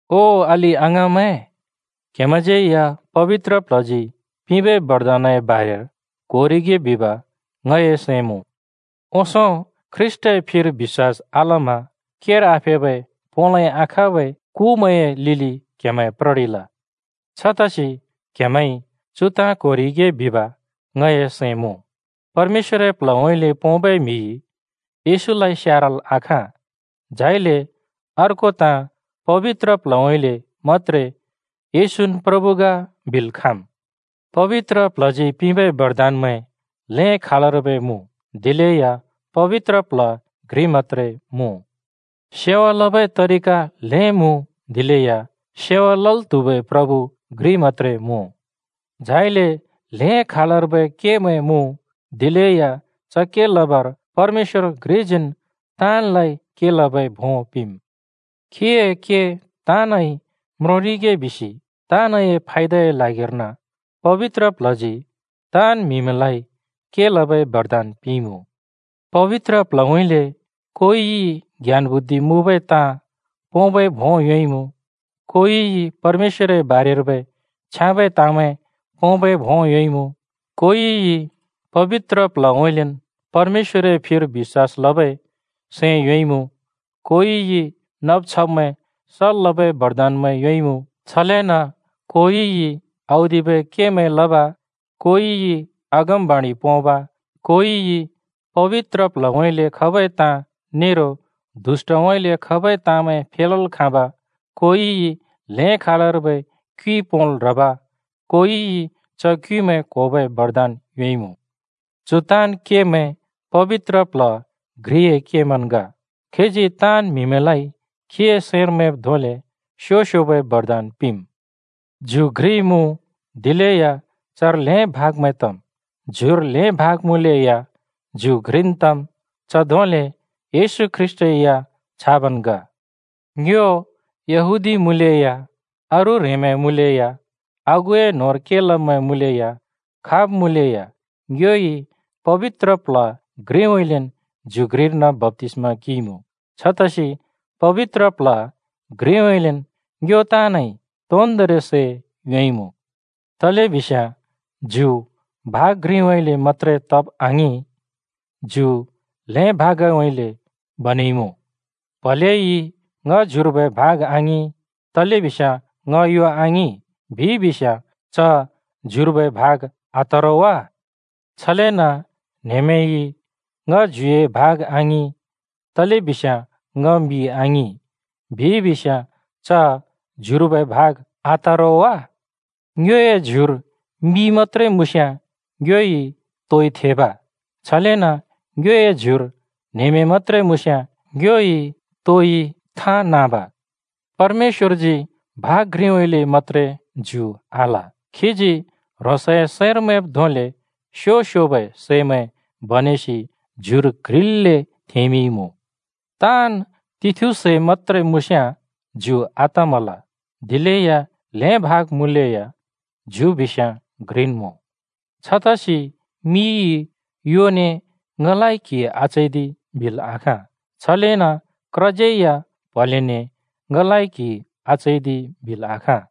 ओ अलि-अङाँमैं, क्हेमैंज्यै या पबित्र प्ल्हजी पिंबै बरदानए बारेर क्होरिगे बिब ङए सैं मुँ। ओंसों ख्रीष्‍टए फिर बिश्‍वास आलमा केर आफेबै पोंलै आखाँबै कुमैंए लिलि क्‍हेमैं प्ररिल। छतसि क्‍हेमैंइ चु ताँ क्होरिगे बिब ङए सैं मुँ, परमेश्‍वरए प्ल्हउँइँले पोंबै म्हिइ येशूलाइ स्यारल् आखाँ, झाइले अर्को ताँ पबित्र प्ल्हउँइँले मत्‍त्रे “येशून् प्रभु ग” बिल् खाँम्। पबित्र प्ल्हजी पिंबै बरदानमैं ल्हें खालर्बै मुँ, दिलेया पबित्र प्ल्ह घ्रि मत्‍त्रे मुँ। सेवा लबै तरिका ल्हें मुँ, दिलेया सेवा लल् त्हुबै प्रभु घ्रि मत्‍त्रे मुँ। झाइले ल्हें खालर्बै केमैं मुँ, दिलेया च के लबर परमेश्‍वर घ्रिजीन् ताँनलाइ के लबै भों पिंम्। खीए के ताँनइ म्रोंरिगे बिसि ताँनए फायदाए ल्हागिर्न पबित्र प्ल्हजी ताँन् म्हिमैंलाइ के लबै बरदान पिंइमुँ। पबित्र प्ल्हउँइँले कोइइ ज्ञान-बुद्धि मुँबै ताँ पोंबै भों योंइमुँ, कोइइ परमेश्‍वरए बारेर्बै छ्याँबै ताँमैं पोंबै भों योंइमुँ, कोइइ पबित्र प्ल्हउँइँलेन् परमेश्‍वरए फिर बिश्‍वास लबै सैं योंइमुँ, कोइइ नब छब्मैं सल् लबै बरदानमैं योंइमुँ, छलेन कोइइ औदिबै केमैं लब, कोइइ अगमबाणि पोंब, कोइइ पबित्र प्ल्हउँइँले खबै ताँ नेरो दुष्‍टउँइँले खबै ताँमैं फेलल् खाँब, कोइइ ल्हें खालर्बै क्युइ पोंल् ह्रब, कोइइ च क्युइमैं क्होबै बरदान योंइमुँ। चु ताँन् केमैं पबित्र प्ल्ह घ्रिए केमैंन् ग। खीजी ताँन् म्हिमैंलाइ खीए सैंर मैंब् धोंले स्‍यो-स्‍योबै बरदान पिंम्। ज्यु घ्रि मुँ, दिलेया चर ल्हें भागमैं तम्, ज्युर ल्हें भाग मुँलेया ज्यु घ्रिन् तम्, च धोंले येशू ख्रीष्‍ट या छाबन् ग। ङ्यो यहूदी मुँलेया, अरू ह्रेंमैं मुँलेया, आगुए न्होंर के लब्मैं मुँलेया, खाब् मुँलेया ङ्योइ पबित्र प्ल्ह घ्रिउँइँलेन् ज्यु घ्रिर्न बप्‍तिस्‍मा किंइमुँ। छतसि पबित्र प्ल्ह घ्रिउँइँलेन् ङ्यो ताँनइ तोन्दोंरि सै योंइमुँ। तलेबिस्याँ ज्यु भाग घ्रिउँइँले मत्‍त्रे तब आङिं, ज्यु ल्हें भागउँइँले बनेइमुँ। प्‍हलेइ “ङ ज्युर्बै भाग आङिं, तलेबिस्याँ ङ यो आङिं” बिइ बिस्याँ, च ज्युर्बै भाग आत रो वा? छलेन न्‍हेमेंइ “ङ ज्युए भाग आङिं, तलेबिस्याँ ङ मि आङिं,” बिइ बिस्याँ च ज्युर्बै भाग आत रो वा? ङ्योए ज्युर मि मत्‍त्रे मुँस्‍याँ ङ्योइ तोइ थेब? छलेन ङ्योए ज्युर न्‍हेमें मत्‍त्रे मुँस्‍याँ ङ्योइ तोइ थाँ नाँब? परमेश्‍वरजी भाग घ्रिउँइँले मत्‍त्रे ज्यु आल, खीजी ह्रोंसए सैंर मैंब् धोंले स्‍यो-स्‍योबै सैमैं बनेसि ज्युर क्ह्रिल्‍ले थेंमिंइँमुँ। ताँन् तिथु सै मत्‍त्रे मुँस्‍याँ ज्यु आतमल। दिलेया ल्हें भाग मुँलेया ज्यु बिस्याँ घ्रिन् मुँ। छतसि मिइ योने “ङलाइ क्‍हि आचैदि” बिल् आखाँ। छलेन क्रज्‍यैया प्‍हलेने “ङलाइ क्‍हि आचैदि” बिल् आखाँ।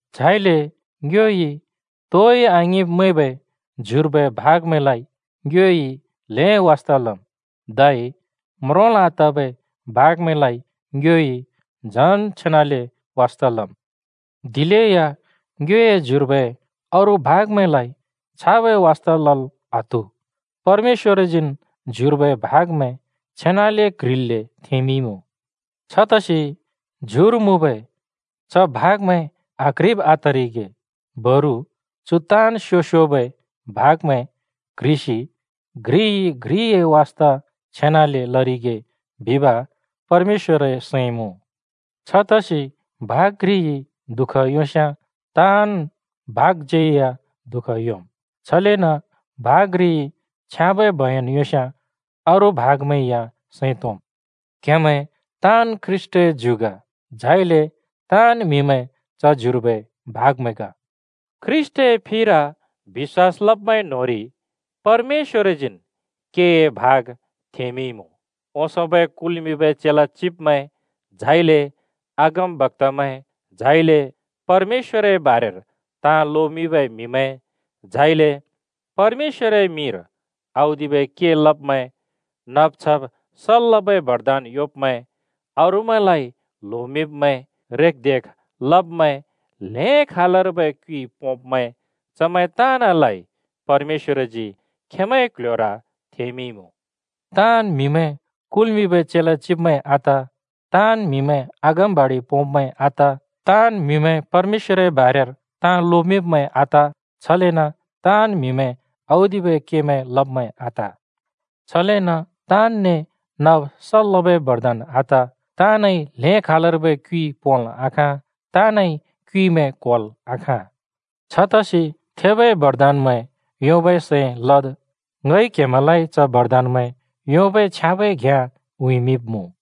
झाइले ङ्योइ तोइ आङिंब् मैंबै ज्युर्बै भागमैंलाइ ङ्योइ ल्हें वास्ता लम्। धै म्रोंल् आतबै भागमैंलाइ ङ्योइ झन् छेनाले वास्ता लम्, दिलेया ङ्योए ज्युर्बै अरू भागमैंलाइ छाबै वास्ता लल् आत्हु। परमेश्‍वरजीन् ज्युर्बै भागमैं छेनाले क्ह्रिल्‍ले थेंमिंइमुँ। छतसि ज्युर मुँबै [अथवा बिश्‍वासीमैं न्‍होंरि] च भागमैं आक्ह्रिब आतरिगे, बरु चु ताँन् स्‍यो-स्‍योबै भागमैं क्ह्रिसि घ्रिइ घ्रिए वास्ता छेनाले लरिगे बिब परमेश्‍वरए सैं मुँ। छतसि भाग घ्रिइ दुःख योंस्‍याँ ताँन् भागज्‍यैया दुःख योंम्, छलेन भाग घ्रिइ छ्याँबै बयन योंस्‍याँ अरू भागमैं या सैं तोंम्। क्‍हेमैं ताँन् ख्रीष्‍टए ज्यु ग। झाइले ताँन् म्‍हिमैं च ज्युर्बै भागमैं ग। ख्रीष्‍टए फिर बिश्‍वास लब्मैं न्‍होंरि परमेश्‍वरजीन् केए भाग थेंमिंइँमुँ। ओंसोंबै कुल्मिंबै चेला चिब्मैं, ङ्हिं अगमबक्‍तामैं, सों परमेश्‍वरए बारेर ताँ लोमिंबै म्‍हिमैं, झाइले परमेश्‍वरए मिंर औदिबै के लब्मैं, नब् छब् सल् लबै बरदान योंब्‍मैं, अरूमैंलाइ ल्होमिंब्‍मैं, रेखदेख लब्मैं, ल्हें खालर्बै क्युइ पोंब्‍मैं ताँनलाइ परमेश्‍वरजी खेंमैंए क्‍ल्‍ह्‍योर थेंमिंइमुँ। ताँन् म्‍हिमैं कुल्मिंबै चेला चिब्मैं आत, ताँन् म्‍हिमैं अगमबाणि पोंब्‍मैं आत, ताँन् म्हिमैं परमेश्‍वरए बारेर ताँ लोमिंब्‍मैं आत, छलेन ताँन् म्हिमैं औदिबै के लब्मैं आत। छलेन ताँनने नब सल् लबै बरदान आत, ताँनइ ल्हें खालर्बै क्युइ पोंल् आखाँ, ताँनइ क्युइमैं क्होल् आखाँ। छतसि थेबै बरदानमैं योंबै सैं लद्। ङइ क्हेमैंलाइ च बरदानमैं योंबै छ्याँबै घ्याँ उँइँमिंब्मुँ।